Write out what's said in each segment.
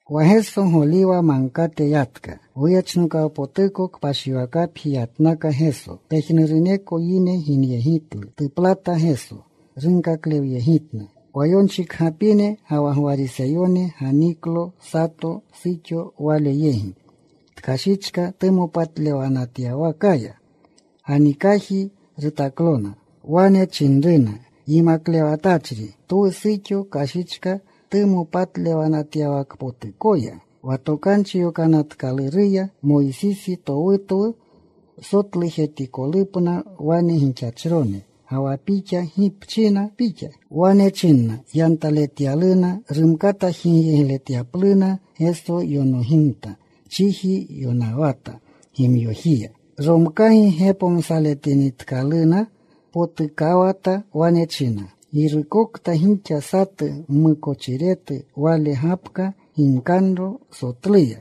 Wa Geso Goliwa Magkate yatka. Goyechnokawpotuko kpashiwakapji yatnaka Geso. Pejnuruneko yine ginyegitlu. Tuplata Geso. Runkaklewyegitna. Wa yonchikgapine ga wa Gwariseyone ganiklo sato suxo Wale yegi. Tkashichka tumopatlewanatyawakaya. Ganikaji rutaklona. Wane chinruna, “Yimaklewatachri, twu suxo kashichka tumopatlewanatyawakpotukoya. Wa Tokanchi Yokanatkaluruya, Moysisi towutwu sotlujetikolupna wane gixachrone. Ga wa Pixa, ¿gi pchina Pixa?” Wane chinna yantaletyaluna rumkata jigyegletyapluna. Geso yonogimta. Chiji yonawata gimyojiya. Romkaga gepomsaletinitkaluna, potukawata. Wane chinna, “Girukokta gixa satu mmukochiretu, wale gapka ginkaganro sotluya.”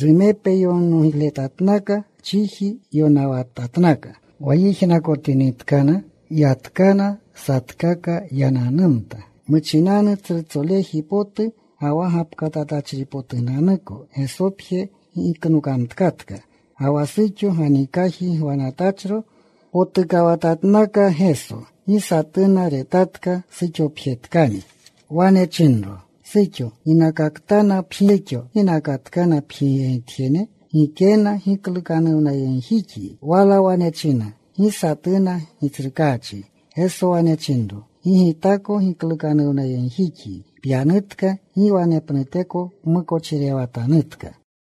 Rumepe yonogletatnaka. Chiji yonawatatnaka. Wa yijnakotinitkana, yatkana. Satkaka yananumta. Muchinanu tsrutsoleji potu ga wa gapkatatachripotunanuko. Gesopje giknokamtkatka, ga wa suxo ganikaji gwanatachro. Potukawatatnaka Geso. Gi satuna retatka. Suxopjetkani. Wane chinro, “Suxo, ¿ginakatkana pjigyegitjene? ¿Gikena giklukanuwnayegjixyi?” Wala wane china, “Gi satuna, Gitsrukaachi.” Geso wane chinro, “Gi Gitako giklukanuwnayegjixyi. Pyanutka. Gi wanepnuteko pmukochirewatanutka.”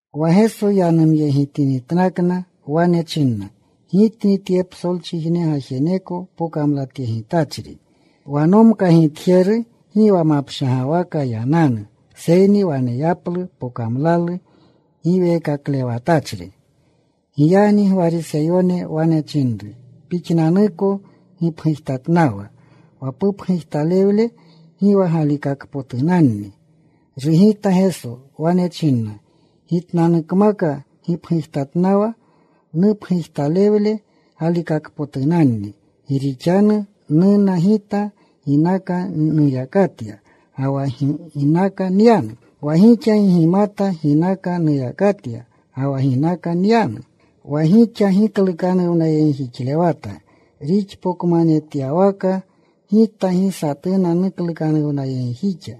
Wa Geso yanumyegitatnakna. Wane china, “Gitni tye psolchijne gajeneko pokamlatyegitachri. Wa nomkagitjeru gi wa mapshagwaka yananu, seyni waneyaplu pokamlalu giweekaklewatachri.” Giyagni Gwariseyone wane chinru, “Pixnanuko gipgujtatnawa. Wa pupgujtalewle gi wa galikakpotunanni.” Rugita Geso. Wane chinna, “Gitnanukmaka gipgujtatnawa. Nupgujtalewle galikakpotunanni. Gi rixanu numata Gita ginaka nuyakatya ga wa ginaka nyanu. Wa gixa gi gimata ginaka nuyakatya ga wa ginaka nyanu. Wa gixa giklukanuwnajixlewata rixpokmanetyawaka. Gita gi satuna nuklukanuwnayegjixa.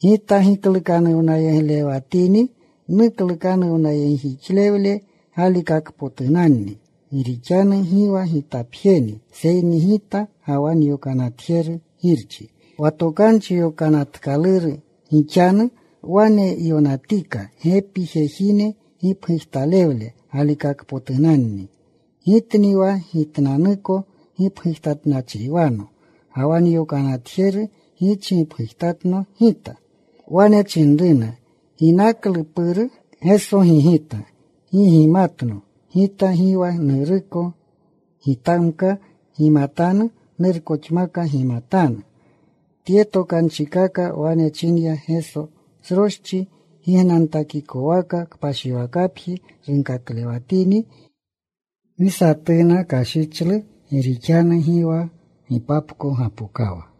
Gita giklukanuwnajixlewatini nuklukanuwnajixlewle galikakpotunanni, gi rixanu gi wa Gitapjeni, seyni Gita ga wa nyokanatjeru, Girchi. Wa Tokanchi Yokanatkaluru gixanu wane yonatika: Gepi jejine gipgujtalewle galikakpotunanni. Gitni wa Gitnanuko gipgujtatnachriwano, ga wa nyokanatjeru Girchi gipgujtatno Gita.” Wane chinruna, “¿Ginaklu Puru?” Geso gigita, “Gi gimatno Gita, gi wa Nuruko. Gitamka gimatanu, Nurkoxmaka gimatanu.” Tye tokanchikaka wane chinya Geso sroschi gignantakikwaka, kpashiwakapji runkaklewatini. Gi satuna kashichlu gi rixanu gi wa gipapko gapokawa.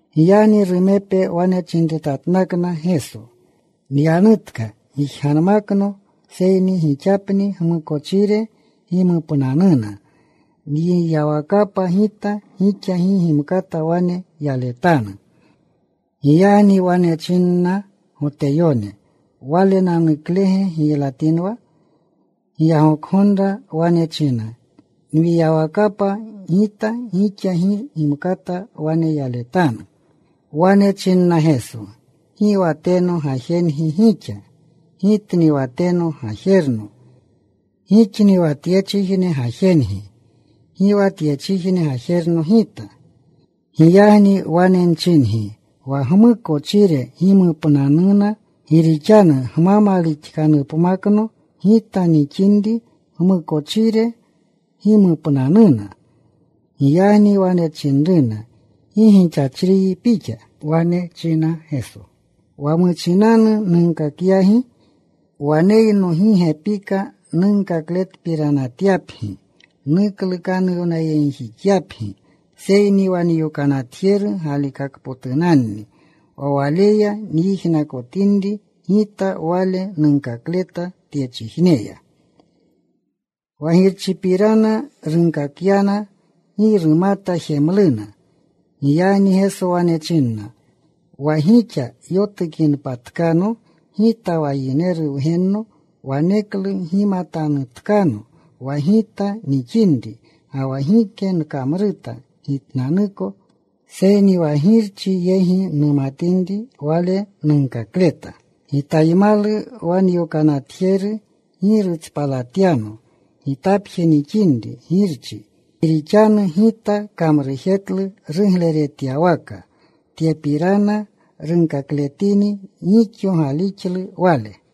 Giyagni rumepe wane chinretatnakna Geso, “Nyanutka. Gijganmakno, seyni gixapni gmukochire gimupnanuna. Nyiyawakapa Gita gixa gi gimkata wane yaletanu.” Giyagni wane chinna Goteyone, “¿Walenanuklege giylatinwa? Giyagoka gonra wane china, ‘Nyiyawakapa Gita, gixa gi gimkata wane yaletanu.’” Wane chinna Geso, “Gi wa teno gajengi gixa. Gitni wa teno gajerno. Gixni wa tyechijne gajengi. Gi wa tyechijne gajerno Gita. Giyagni wane nchingi wa gmukochire gimupnanuna. Gi rixanu, gma malixkanupmakno Gita nixinri gmukochire gimupnanuna.” Giyagni wane chinruna, “¿Gi gixachriyi Pixa?” Wane chinna Geso, “Wa muchinanu nunkakyagi. Waneyno gi gepika nunkakletpiranatyapgi, nuklukanuwnayegjixapgi, seyni wa nyokanatjeru galikakpotunanni. Wa Waleya nyijnakotinri Gita, wale nunkakleta tyechijneya.” Wa Girchipirana runkakyana. Gi rumata jemluna Giyagni Geso wane chinna, “Wa gixa yotukinpatkano Gita wa Yineru Wgenno, waneklu gimatanutkano wa Gita nixinri, ga wa gike nkamruta Gitnanuko, seyni wa Girchi yegi numatinri wale nunkakleta. Gitaymalu wa nyokanatjeru. Gi rutspaltapyano Gitapje nixinri Girchi. Gi rixanu Gita kamrujetlu rugleretjetyawaka.” Tyepirana runkakletini, gixo galixlu Wale.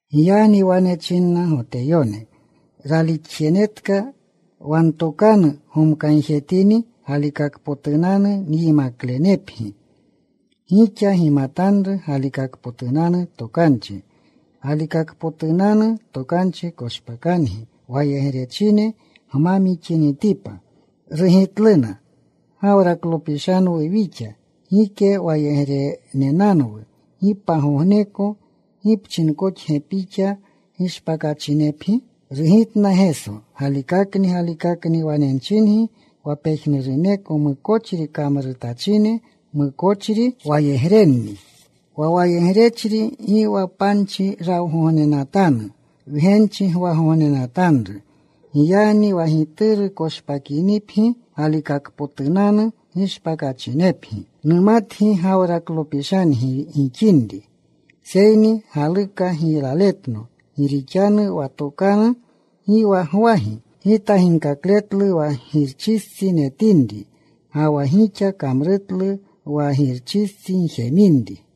Giyagni wane chinna Goteyone ralixjenetka, “Wa ntokanu gomkayegitini, galikakpotunanu nyimaklenepgi. Gixa gimatanru galikakpotunanu tokanchi. Galikakpotunanu tokanchi koshpakangi wayegrechine gma mixinitipa.” Rugitluna, “Gawraklopishanwu wixa. Gike wayegrenenanwu, gi pagogneko. ¿Gi pchinkoxge Pixa, ‘Gishpakachinepgi?’” Rugitna Geso, “Galikakni, galikakni, wane nchingi, wa pejnuruneko mukochri kamrutachine, mukochri wayegrenni. Wa wayegrechri gi wa panchi rawgognenatanu. Wgenchi gwagognenatanru. Giyagni wa Gituru koshpakinipgi, galikakpotunanu gishpakachinepgi. Numatgi Gawraklopishangi gixinri, seyni galuka giylaletno, gi rixanu wa ntokanu gi wa gwagi. Gita ginkakletlu wa Girchistsi netinri, ga wa gixa kamrutlu wa girustsi gjeminri.”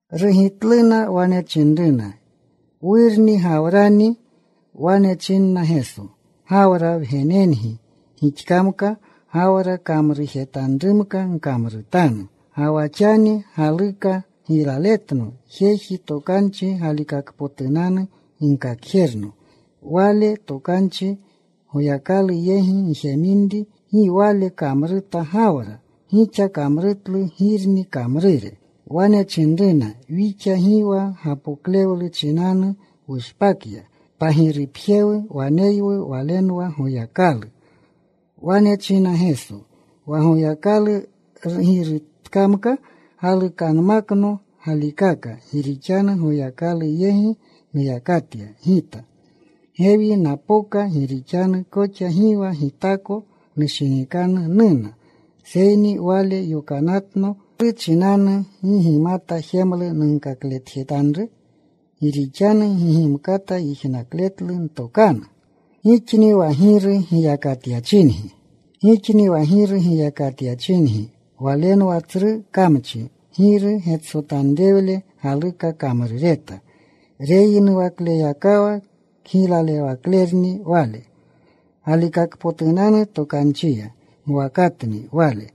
Rugitluna. Wane chinruna, “Wurni Gawrani.” Wane chinna Geso, “Gawra wgenengi gixkamka, Gawra kamrujetanrumka gkamrutanu. Ga wa xani galuka giylaletno, jeji tokanchi galikakpotunanu ginkakjerno. Wale tokanchi Goyakalu yegi njeminri. Gi wale kamruta Gawra. Gixa kamrutlu girni kamrure.” Wane chinruna, “Wixa gi wa gapoklewlu chinanu wushpakya. Pagirupje waneywu. Walenwa Goyakalu.” Wane chinna Geso, “Wa Goyakalu girutkamka, galukanmakno galikaka. Gi rixanu Goyakalu yegi nuyakatya Gita. Gewi napoka. Gi rixanu koxa gi wa Gitako nushinikanu nuna, seyni Wale yokanatno. ¿Klu chinanu gi gimata jemlu nunkakletjetanru? Gi rixanu gi gimkata yijnakletlu ntokanu. “Gixni wa giru giyakatyachingi. Walenwa tsru kamchi. Giru getsotanrewle galuka kamrureta. Reyinuwakleyakawa kgiylalewaklerni wale. Galikakpotunanu tokanchiya mwakatni wale.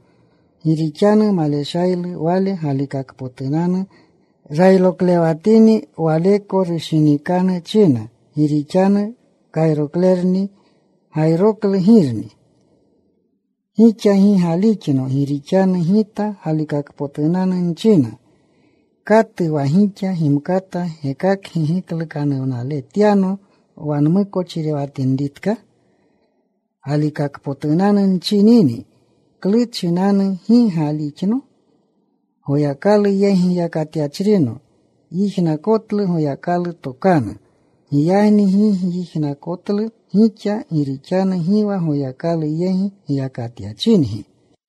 Gi rixanu maleshaylu wale galikakpotunanu. Rayroklewatini, waleko rushinikanu china, gi rixanu kayroklerni. Gayroklu girni. Gixa gi galixno, gi rixanu Gita galikakpotunanu nchina. ¿Katu wa gixa gimkata gekakgi giklukanuwnaletyano wa nmukochirewatinritka? Galikakpotunanu nchinini, ¿klu chinanu gi galixno? Goyakalu yegi giyakatyachri yijnakotlu Goyakalu tokanu. Giyagni gi gyijnakotlu gixa, gi rixanu gi wa Goyakalu yegi giyakatyachingi.”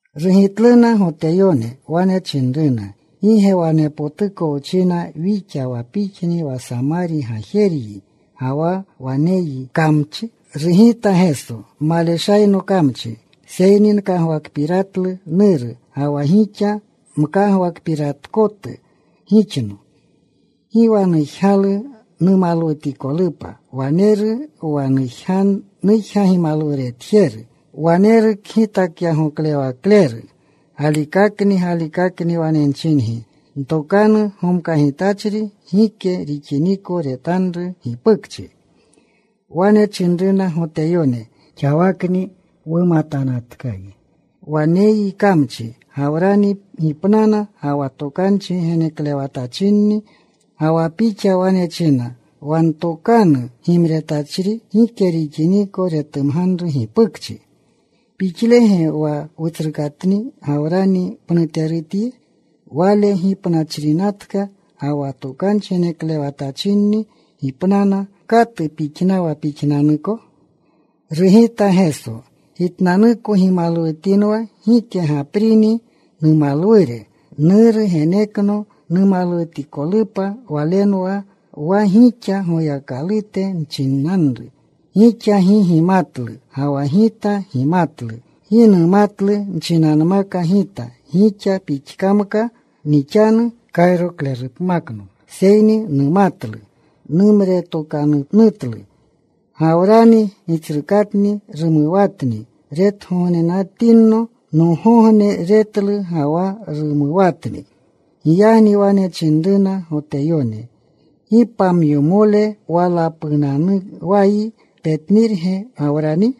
Rugitluna Goteyone. Wane chinruna, “¿Gi ge wanepotuko wchina wixa, wa Pixni wa Samari gajeryi, ga wa waneyyi kamchi?” Rugita Geso, “Maleshayno kamchi, seyni nkagwakpiratlu Nuru, ga wa gixa mkagwakpiratkotu gixno. Gi wa nujgalu numalwutikolupa. Waneru wa nujga gimalwuretjeru. Waneru kgitakyagoklewakleru. Galikakni, galikakni wane nchingi, ntokanu gomkagitachri gike rixiniko retanru gipukchi.” Wane chinruna Goteyone, “Xawakni wumatanatkayi waneyyi kamchi. Gawrani gipnana ga wa tokanchi geneklewatachinni. Ga wa Pixa wane china, ‘Wa ntokanu gimretachri gike rixiniko retumganru gipukchi.’ ¿Pixlege wa wutsrukatni Gawrani pnutepgutyi? Wale gipnachrinatka. Ga wa tokanchi geneklewatachinni gipnana. ¿Katu pixnawa Pixnanuko?” Rugita Geso, “Gitnanuko gimalwutinwa, gike gaprini numalwure. Nuru genekno numalwutikolupa. Walenwa wa gixa Goyakalute nchinanru. Gixa gi gimatlu, ga wa Gita gimatlu. Gi numatlu, nchinanmaka Gita, gixa pixkamka nixanu kayroklerupmakno. Seyni numatlu. Numretatokanutlu. Gawrani gitsrukatni rumuwatni retgognetinno nogogne. Retlu ga wa rumuwatni.” Giyagni wane chinruna Goteyone, “Gi pamyomole walapuunawayi. ¿Petnirge Gawrani?”